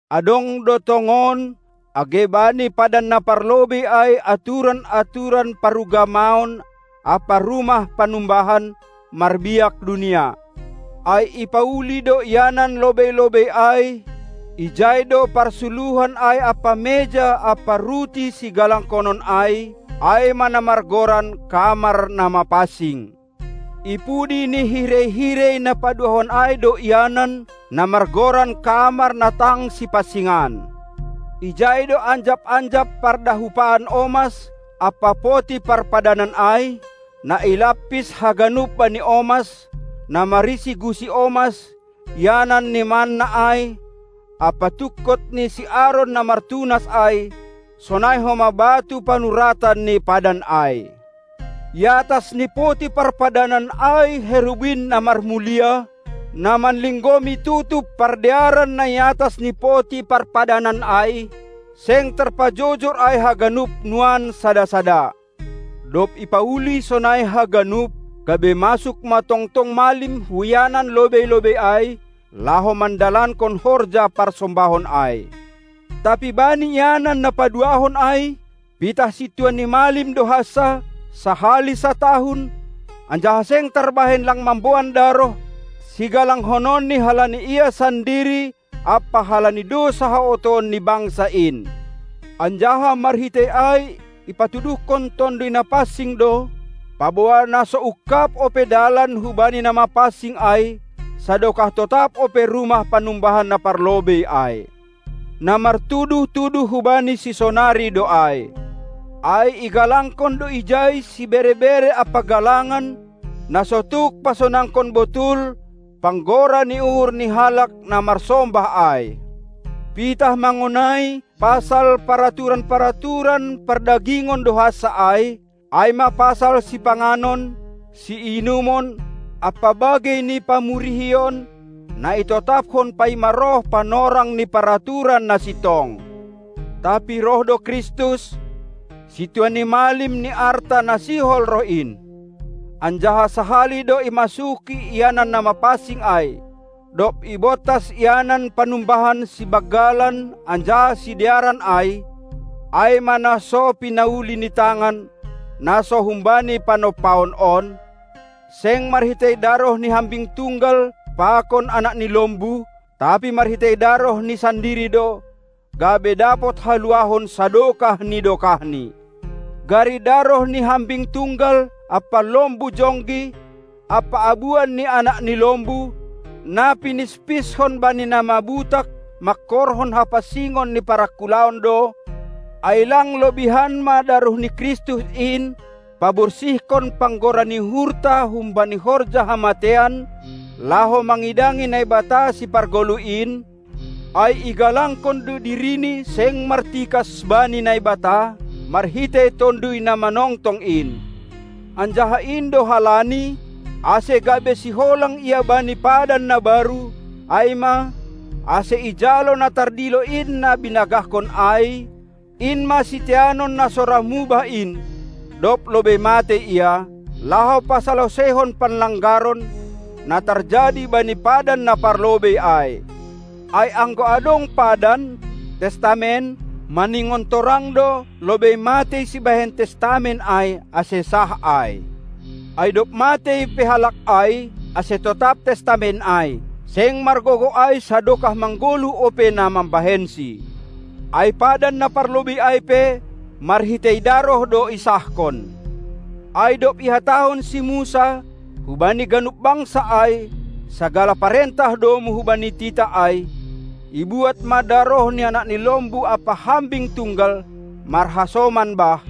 Adong do, tongon, age bani padan na parlobei ai aturan-aturan parugamaon ampa rumah panumbahan, marbiak dunia. Ai ipauli do ianan lobei-lobei ai, ijai do parsuluhan ai ampa meja ampa ruti sigalanghonon ai; ai ma na margoran kamar na mapansing. Ipudi ni hirei-hirei na paduahon ai do ianan, na margoran kamar na tang sipansingan. Ijai do anjap-anjap pardahupaan omas ampa poti parpadanan ai, na ilampis haganup bani omas, na marisi gusi omas, ianan ni manna ai, ampa tungkot ni si Aron na martunas ai, sonai homa batu panuratan ni padan ai. Iatas ni poti parpadanan ai Herubin na marmulia, na manlinggomi tutup pardearan na i atas ni poti parpadanan ai; seng tarpajojor ai haganup nuan sada-sada. Dob ipauli sonai haganup, gabe masuk ma tongtong malim hu ianan lobei-lobei ai, laho mandalankon horja parsombahon ai. Tapi bani ianan na paduahon ai, pitah sintua ni malim do hansa, sahali satahun, anjaha seng tarbahen lang mamboan daroh, sigalanghononni halani ia sandiri ampa halani dousa haotoon ni bangsa in. Anjaha marhitei ai ipatuduhkon Tonduy Napansing do, paboa na so ungkab ope dalan hubani na mapansing ai, sadokah totap ope rumah panumbahan na parlobei ai. Na martuduh-tuduh hubani sisonari do ai; ai igalangkon do ijai sibere-bere ampa galangan, na so tuk pasonangkon botul panggora ni uhur ni halak na marsombah ai. Pitah mangonai pasal paraturan-paraturan pardagingon do hansa ai, ai ma pasal sipanganon, siinumon ampa bagei ni pamurihion, na itotaphon paima roh panorang ni paraturan na sintong. Tapi roh do Kristus, Sintua ni malim ni arta na sihol roh in. Anjaha sahali do imasuki ianan na mapansing ai, dob ibontas ianan panumbahan sibanggalan anjaha sidearan ai, ai ma na so pinauli ni tangan, na so humbani panompaon on; seng marhitei daroh ni hambing tunggal pakon anak ni lombu, tapi marhitei darohni sandiri do, gabe dapot haluahon sadokah ni dokahni. Gari daroh ni hambing tunggal ampa lombu jonggi ampa abuan ni anak ni lombu, na pinispishon bani na mabutak mangkorhon hapansingon ni parangkulaon do; ai lang lobihan ma daroh ni Kristus in paborsihkon panggora ni uhurta humbani horja hamateian, laho mangidangi Naibata Sipargoluh in? Ai igalangkon do dirini seng martikas bani Naibata, marhitei Tonduy na manongtong in. Anjaha in do halani, ase gabe siholang Ia bani padan na baru, ai ma, ase ijalo na tardilo in na binagahkon ai, in ma siteanon na so ra mubah in, dob lobei matei Ia, laho pasaloseihon panlanggaron, na tarjadi bani padan na parlobei ai. Ai anggo adong padan (testament), maningon torang do lobei matei sibahen testament ai, ase sah ai. Ai dob matei pe halak ai, ase totap testament ai; seng margogoh ai sadokah manggoluh ope na mambahensi. Ai padan na parlobei ai pe, marhitei daroh do isahkon. Ai dob ihatahon si Musa hubani ganup bangsa ai sagala parentah domu hubani titah ai, ibuat ma daroh ni anak ni lombu ampa hambing tunggal marhasoman bah,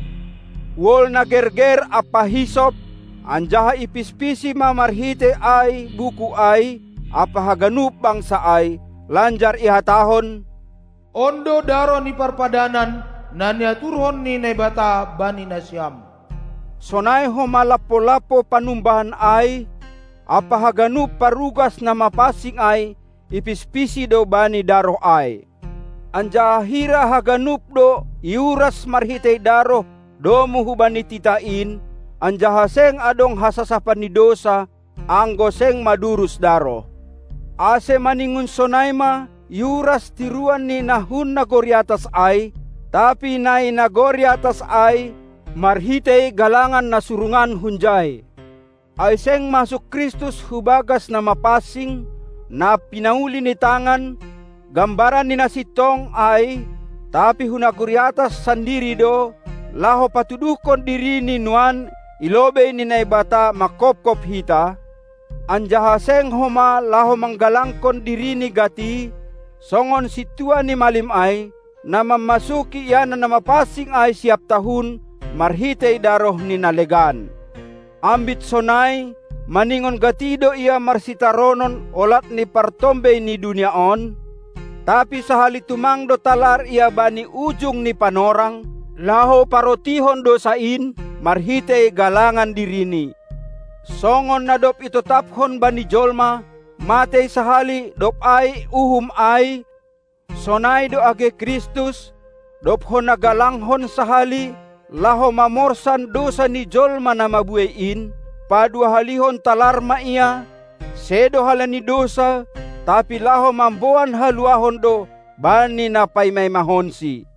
wol na gerger ampa hisop, anjaha ipispisi ma marhitei ai buku ai ampa haganup bangsa ai, lanjar ihatahon: On do daroh ni parpadanan, na niaturhon ni Naibata bani nasiam. Sonai homa lampo-lampo panumbahan ai ampa haganup parugas na mapansing ai ipispisi do bani daroh ai. Anjaha hira haganup do iuras marhitei daroh domu hubani titah in; anjaha seng adong hasasapan ni dousa, anggo seng madurus daroh. Ase maningon sonai ma iuras tiruan ni na hun nagori atas ai, tapi na i nagori atas ai, marhitei galangan na surungan hunjai. Ai seng masuk Kristus hubagas na mapansing, na pinauli ni tangan, gambaran ni na sintong ai, tapi hu nagori atas sandiri do, laho patuduhkon diriNi nuan i lobei ni Naibata manghophop hita, anjaha seng homa laho manggalangkon diriNi gati, songon sintua ni malim ai, na mammasuki ianan na mapansing ai siap tahun marhitei daroh ni na legan. Ambit sonai, maningon gati do Ia marsitaronon olat ni partombei ni dunia on: tapi sahali tumang do talar Ia bani ujung ni panorang, laho parontihon dousa in, marhitei galangan diriNi. Songon na dob itotaphon bani jolma, matei sahali dob ai uhum ai, sonai do age Kristus, dob hona galanghon sahali, laho mamorsan dousa ni jolma na mabuei in; paduahalihon talar ma Ia, sedo halani dousa, tapi laho mamboan haluahon do bani na paima-imahonSi.